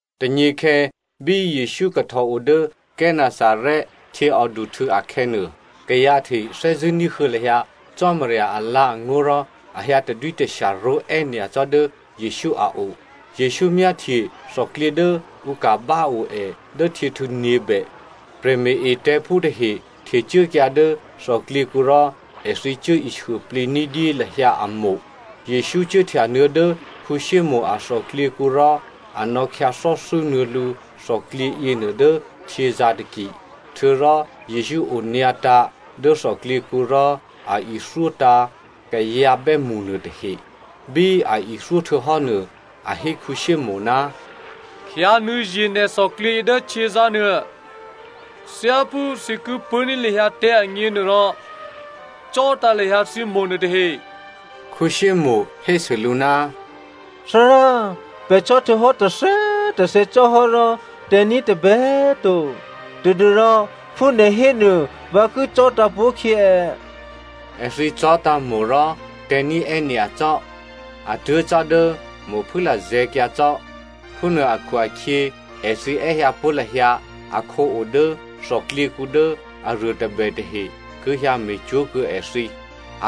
Tônyěkhè̌ bí Jesǔ kahtò o dố Gennesaret htyěòduhtû̌ akhè̌nuô, kayǎ tahe thè́zṳ̂́ ní̤huô̌ lahyǎ Cò́marya alǎ̤angó̤ rò a hyǎ tadwítashya ró̤è́ nyacò́ dố Jesǔ a o. Jesǔ myáhtye thòklyě dố ǔ ka̤ báo è dố htyěhtû̌ nyě̤bè. Prè̤me̤-etè̤̌phú tahe htecuốkyǎ dố thòklyěkǔ rò èthǐ cuố ishuôplǐ ní̤dyé lahyǎ a itavǐ. Jesǔ cuốhtyanuô̌ dố Simonè a thòklyěkǔ rò a nò̌khyǎ thò́thû́nuô̌ lǔ thòklyě yěnuô dố htyězǎ̤ taki, htuô̌rò Jesǔ onyǎtǎ̤ dố thòklyěkǔ rò a ithyótǎ̤ kayǎ bè́mṳ nuôtahe. Bí a ithyó htuô̌hò́nuô, a hé Simonè, “Khyǎnuô̌ye̤ nè̤ thòklyěyě dố htyězǎ̤nuô. Thyáphú thǐ ki pṳ̂́ní̤ lahyǎ tè̤̌ agněnuôrò, cò̤́tǎ̤ lahyǎ thǐ itavǐ nuôtahe.” Simonè hésû lǔ, “Thárá, pè̤ cò̤́htuô̌hò́ tôthè̌꤮ tôthè̌ cò́hò́ rò tè̤̌ní̤ tôbè꤮ to, tadû́rò phú nè̤ hénuô vǎ ki cò̤́tǎ̤ pó̤khyě è꤮.” Èthǐ cò̤́tǎ̤ itavǐ rò tè̤̌ní̤ è́nyacò́, a tuố̤ cò́ dố itavǐ phû lazè̤̌kyǎ cò́. Phúnuô akhu-akhyě, èthǐ è́hyǎ pó̤ lahyǎ akhǒ o dố thòklyěkǔ dố aruô tôbè tahe ki hyǎ me̤cwó̤kuô̌ èthǐ.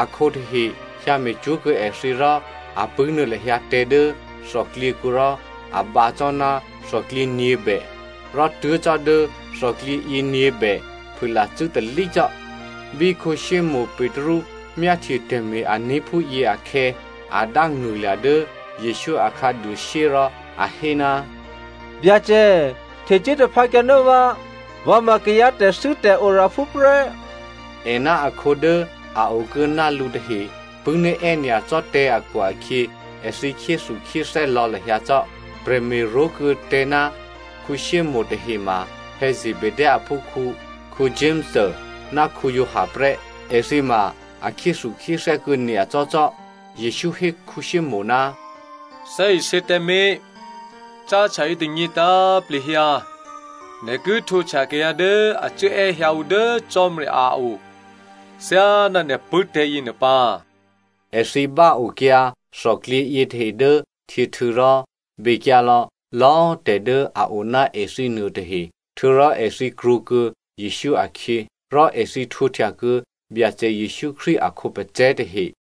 Akhǒ tahe hyǎ me̤cwó̤ kuô̌ èthǐ rò a pṳ̂́nuô̌ lahyǎ tè̤̌ dố thòklyěkǔ rò a bǎ cò́ ná thòklyě nyě̤bè, rò tuố̤ cò́ dố thòklyě yěnyě̤bè phûlacû́ talí cò́. Bí Simonè Petru myáhtye tè̤me̤-ané̤ phúyě akhè̌, a dángṳ̂lya̤ dố Jesǔ a khǎduôshyé rò a hé, “Byacè, htecuố taphǎkyǎ ná vǎ, vǎ ma kayǎ tè̤thû́tè̤oraphú prè́.” È ná akhǒ dố a o kuô̌ ná lǔ tahe pṳ̂́ní̤ è́nyacò́ tè̤̌ akhu-akhyě, èthǐ khyéthukhyéthè́ lò̌ lahyǎ cò́. Prè̤me̤ró̤kuô̌ tè̤̌ ná Simonè tahema Zebedeo aphúkhǔ, Jakomo ná Giovanni prè́. Èthǐ ma a khyéthukhyéthè́ kuô̌ nyacò́ cò́. Jesǔ hé Simonè, “Thè́isě tǎmé̤, cáhtya yětônyě tǎ̤plehyǎ, nè̤ ki htwǒhtya kayǎ dố a cuốè́hyǎ ǔ dố Cò́marya a o thyáná nè̤ pṳ̂́tè̤̌ yěnuô pǎ.” Èthǐ báokyǎ thòklyě yětahe dố htyěhtû̌ rò, bekyǎ lò̌lò̌꤮ tè̤ dố a o ná èthǐ nuôtahe htuô̌rò èthǐ krwǒkuô̌ Jesǔ akhyě. Rò èthǐ htwǒhtyakuô̌ Byacè Jesǔ Krístu a khǒpacè̤̌ tahe.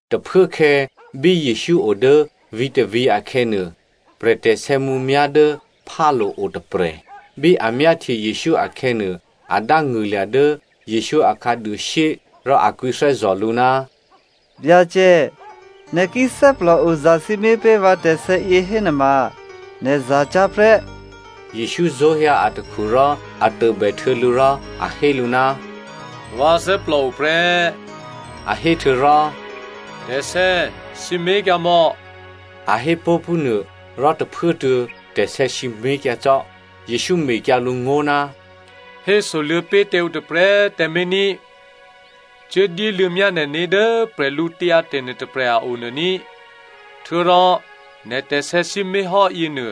Tôphuốkhè̌ bí Jesǔ o dố vǐ̤tôvǐ̤ akhè̌nuô, prè̤bè tè̤sè̌mǔmyá̤ dố phálo̤ o tôprè̤. Bí a myáhtye Jesǔ akhè̌nuô, a dángṳ̂lya̤ dố Jesǔ a khǎduôshyé, rò a kwǐthè́zò̤ lǔ, “Byacè꤮, nè̤ ki thè́plòo zasǐmé̤ pé̤ vǎ tè̤sè̌yě hénuôma nè̤ za cyá̤ prè́.” Jesǔ zó̤hyǎ atakhu rò a tôbèhtuô̌ lǔ rò a hé lǔ, “Vǎ thè́plòo prè́,” a hé htuô̌rò “Tè̤sè̌꤮ sǐmé̤kyǎmò̌,” a hé pó̤ phúnuô, rò tôphuốtuô̌ tè̤sè̌ sǐmé̤kyǎ cò́. Jesǔ mekyǎ lǔ ngó̤, “Hésoluô̌ pé̤ tǎ ǔ tôprè̤꤮ tǎmé̤ ní꤮. Cuố dyéluô̌myá nè̤né̤ dố bwídu nuôtôprè̤ a o nuô ní꤮. Htuô̌rò nè̤ tè̤sè̌ sǐmé̤hò́ yěnuô,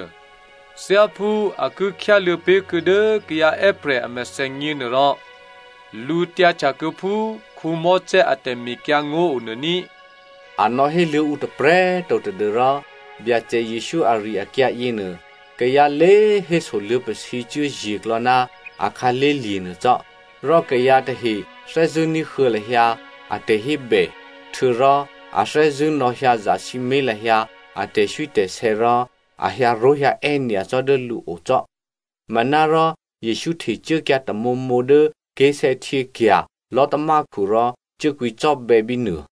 thyáphú a ki khyáluô̌ pé̤kuô̌ dố kayǎ è́prè̤ a mèthènyě nuôrò lǔtyǎhtya kuô̌ phú Mosè a tè̤mekyǎngó̤ o nuô ní꤮.” A nò̌héluô̌ ǔ tôprè̤꤮ to tadû́rò Byacè Jesǔ ari-akyǎ yěnuô, kayǎ lé héso luô̌pasǐcuố ye̤klò̌ ná a khǎlé̤lye̤ nuô cò́, rò kayǎ tahe thè́zṳ̂́ ní̤huô̌ lahyǎ a tè̤hébè, htuô̌rò a thè́zṳ̂́ nò̌hyǎ zasǐmé̤ lahyǎ a tè̤swítè̤sè̌ rò a hyǎró̤hyǎè́ nyacò́ dố lǔo cò́. Manárò Jesǔ htecuốkyǎ tamǒmǒ dố ké̤sè̌htyěkya̤ lò̤́tamákhu rò cuố kwǐcò́bè̌ bínuô.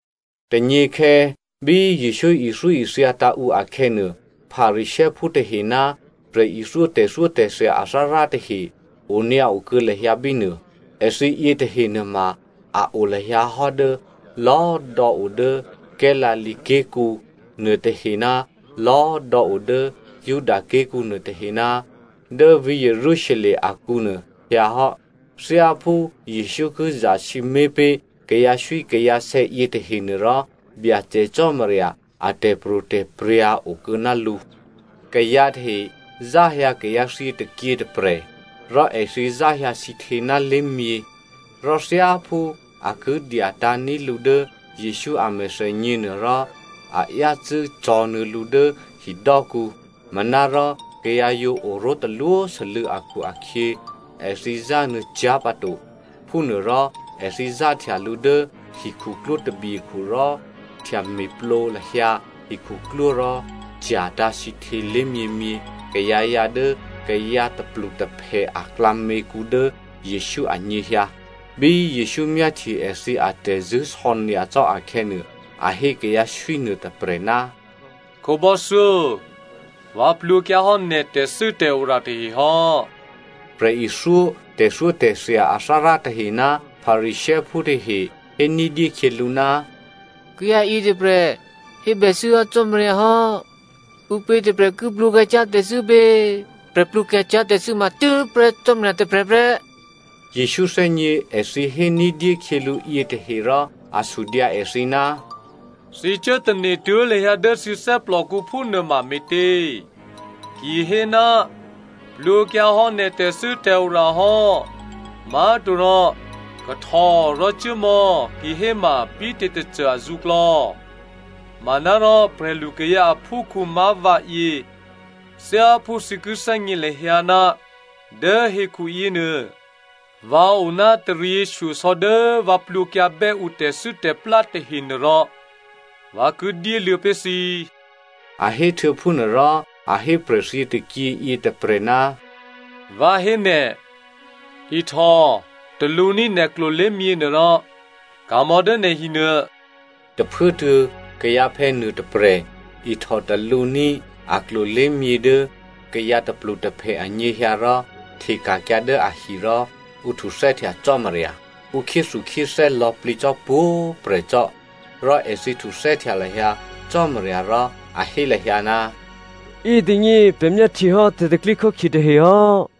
Tônyěkhè̌ bí Jesǔ ithyóithyatǎ̤ ǔ akhè̌nuô, Pharisěophú tahe ná prè̤ithyó tè̤thyótè̤thya athárá tahe onyǎo kuô̌ lahyǎ bínuô. Èthǐ yětahe nuôma a o lahyǎ hò́ dố lò̌꤮ dò̌ o dố Galilea ké̤kǔ, nuôtahe ná lò̌꤮ dò̌ o dố Juda ké̤kǔ nuôtahe ná dố vǐ̤ Jerusalem akǔnuô hyǎ hò́. Thyáphú Jesǔ ki zasǐmé̤ pé̤ kayǎswíkayǎsè̌ yětahenuôrò Byacè Cò́marya a tè̤pro̤tè̤prya̤ okuô̌ ná lǔ. Kayǎ tahe záhyǎ kayǎ thyětôkyě tôprè̤, rò èthǐ záhyǎ sǐhtě ná lé̤myě. Rò thyáphú a ki dyatǎ̤ní̤ lǔ dố Jesǔ a mèthènyě nuôrò, a yácû́ cò̤̌nuô̌ lǔ dố hidò́kǔ. Manárò kayǎ yǒ oró̤ talwósû́lû̌ akhu-akhyě, èthǐ zánuô̌ cyá̤ pǎto. Phúnuôrò èthǐ záhtya lǔ dố hikhuklwó tabyekhu rò htyame̤plǒ lahyǎ hikhuklwó rò cya̤tǎ̤ sǐhtělò̌ lé̤myěmyě kayǎyǎ dố kayǎ tôplutôphè aklǎměkǔ dố Jesǔ anyěhyǎ. Bí Jesǔ myáhtye èthǐ atè̤zṳ̂́sò̌ nyacò́ akhè̌nuô, a hé kayǎ swí nuôtôprè̤, “Khǒbò́thyó꤮ vǎ plwǒkyǎ hò́ nè̤ tè̤thû́tè̤ora tahe hò́.” Prè̤ithyó tè̤thyótè̤thya athárá tahe ná Pharisěophú tahe hé ní̤dyé khyělǔ, “Kayǎ yětôprè̤ hébèthû́ hò́ Cò́marya hò́. Ǔpě tôprè̤ ki plwǒkyǎ cyá̤ tè̤thû́ pě? Prè̤ plwǒkyǎ cyá̤ tè̤thû́ ma tû́prè́ Cò́marya tôprè̤ prè́.” Jesǔ thè́gně èthǐ hé ní̤dyé khyělǔ yětahe rò a sudyǎ èthǐ, “Thǐ cuốtane̤ tuố̤ lahyǎ dố thǐ thè́plòkǔ phúnuôma me̤tě? Ki hé, ‘Plwǒkyǎhò́ nè̤ tè̤thû́tè̤ora hò́,’ má̤torò ‘Kahtò rò cuốmò̌,’ kihéma bítě tôcô azǔklò̌? Manárò prè̤lukayǎ aphúkhǔ má̤ vǎyě, thyáphú thǐ ki thè́gně lahyǎ, dố hekhu yěnuô, vǎ o ná taryěshyosò̌ dố vǎ plwǒkyǎbè́ ǔ tè̤thû́tè̤plá tahenuôrò, vǎ ki dyéluô̌ pé̤ thǐ,” a héhtuô̌ phúnuô rò a hé prè̤thyětôkyě yětôprè̤, “Vǎ hé nè̤, ihtò talǔní̤ nè̤ klolé̤myě nuôrò ka̤mò̌ dố nè̤ hinuô.” Tôphuốtuô̌ kayǎphè̌ nuôtôprè̤ ihtò talǔní̤ a klolé̤myě dố kayǎ tôplutôphè anyěhyǎ rò hteka̤kyǎ dố ahi rò a htuthè́htya Cò́marya. Ǔ khyéthukhyéthè́ lò̌plǐ cò́ pwǒ̤꤮ prè̤ cò́. Rò èthǐ htuthè́htya lahyǎ Cò́marya rò a hé lahyǎ, “Yětônyě, pè̤ myáhtyehò́ tè̤pro̤tè̤prya̤ tahe hò́!”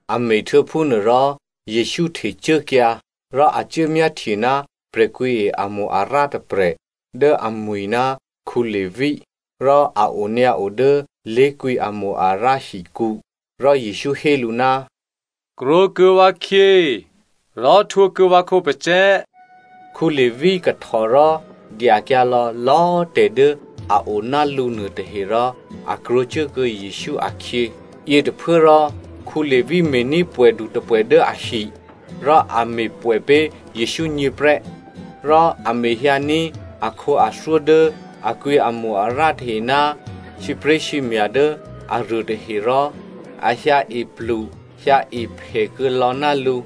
A me̤htuô̌ phúnuô rò, Jesǔ htecuốkyǎ, rò a cuốmyáhtye ná prè̤kwǐe amo-arǎ tôprè̤ dố amwi̤ ná Levi. Rò a onyǎo dố lé̤kwǐ amo-arǎ hikǔ. Rò Jesǔ hé lǔ, “Krwǒkuô̌ vǎkhyě rò htwǒ kuô̌ vǎ khǒpacè̤̌.” Levi kahtò rò dyakyǎ lò̌lò̌꤮ tè̤ dố a o ná lǔ nuôtahe rò a krwǒcuốkuô̌ Jesǔ akhyě. Yětôphuốrò, Levi me̤ní̤ pwè̌du tôpwè̌ dố ahi, rò a me̤pwè̌ pé̤ Jesǔgně prè́. Rò a mehyǎní̤ akhǒathyó dố a kwǐ amo-arǎ tahe ná sǐpré̤sǐmya̤ dố aruôtahe, rò a hyǎepluhyǎephè kuô̌ lò̌ ná lǔ.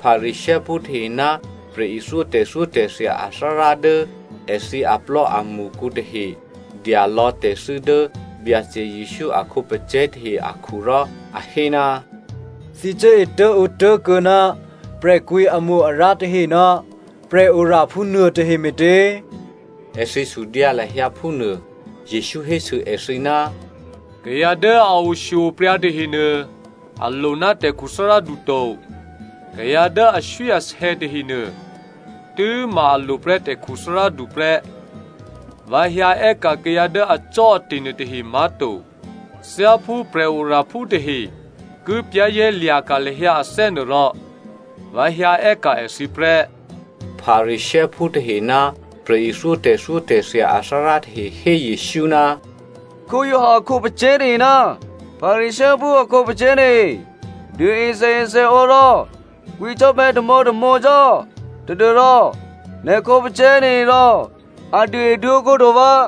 Pharisěophú tahe ná prè̤ithyó tè̤thyótè̤thya athárá dố èthǐ aplò́amṳkǔ tahe dya lò̌ tè̤thû́ dố Byacè Jesǔ a khǒpacè̤̌ tahe akhu rò a hé, “Thǐ cuố etố̤ǒtố̤kuô̌ ná prè̤kwǐamo-arǎ tahe ná prè̤oraphú nuôtahe me̤tě?” Èthǐ sudyǎ lahyǎ phúnuô. Jesǔ hésû èthǐ, “Kayǎ dố a oshyo-opryǎ tahenuô a lo ná tè̤khuthárádu to. Kayǎ dố aswíasè̌ tahenuô tû́ma a lo prè́ tè̤khuthárádu prè́. Vǎ hyǎ è́ka̤ kayǎ dố acò́ate̤ nuôtahe má̤to. Thyáphú prè̤oraphú tahe ki za̤ ní̤dû lahyǎ ané̤ nuôrò, vǎ hyǎ è́ka̤ èthǐ prè́.” Pharisěophú tahe ná prè̤ithyó tè̤thyótè̤thya athárá tahe hé Jesǔ, “Giovanni a khǒpacè̤̌ tahe ná Pharisěophú a khǒpacè̤̌ tahe duôe sèesèǒ rò kwǐcò́bè̌ tamǒtamǒ cò́ tadû́rò nè̤ khǒpacè̤̌ taherò a duôeduôǒ kuô̌ǔ to vǎ.”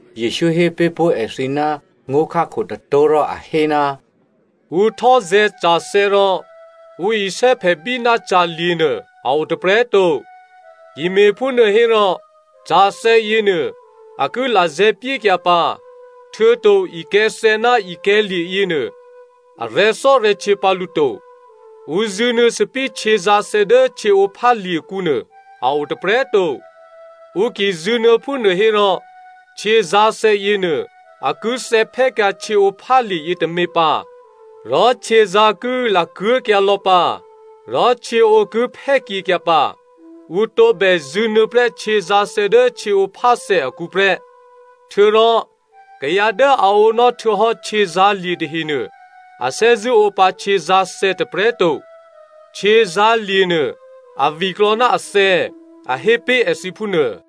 Jesǔ hé pé̤ pó̤ èthǐ ná ngó̤khákho tôtó̤ rò a hé, “Ǔ htò́zè̤̌ ca̤thè̌ rò ǔ isè́phèbí ná ca̤lye̤ nuô a o tôprè̤꤮ to. Ki me̤phúnuô hérò ca̤thè̌yěnuô a ki lazè̤̌pyékyǎ pǎ, htuô̌to ikè̤̌thè̌ ná ikè̤̌lye̤ yěnuô arè̤̌thò́rè̤̌htyě pǎ lǔ to. Ǔ zṳ̂nuô̌ thòbǐthèhtyězǎ̤thè dố htyěǒphálye̤kǔ nuô a o tôprè̤꤮ to. Ǔ ki zṳ̂nuô̌ phúnuô hérò htyězǎ̤thè̌ yěnuô a ki thè̌phè́kyǎ htyěǒphálye̤ yětômě pǎ, rò htyězǎ̤ ki lakuố̤kyǎ lò̌ pǎ, rò htyěǒ ki phè́pyékyǎ pǎ. Ǔ tǒbè zṳ̂nuô̌ prè́ htyězǎ̤thè̌ dố htyěǒpháthè̌ akǔ prè́꤮. Htuô̌rò kayǎ dố a ǒnò́ htuô̌hò́ htyězǎ̤lye̤ tahenuô a thè́zṳ̂́ ǒ pǎ htyězǎ̤thè̌ tôprè̤꤮ to. ‘Htyězǎ̤lye̤ nuô a viklò̌ ná athè̌,’ a hé pé̤ èthǐ phúnuô.”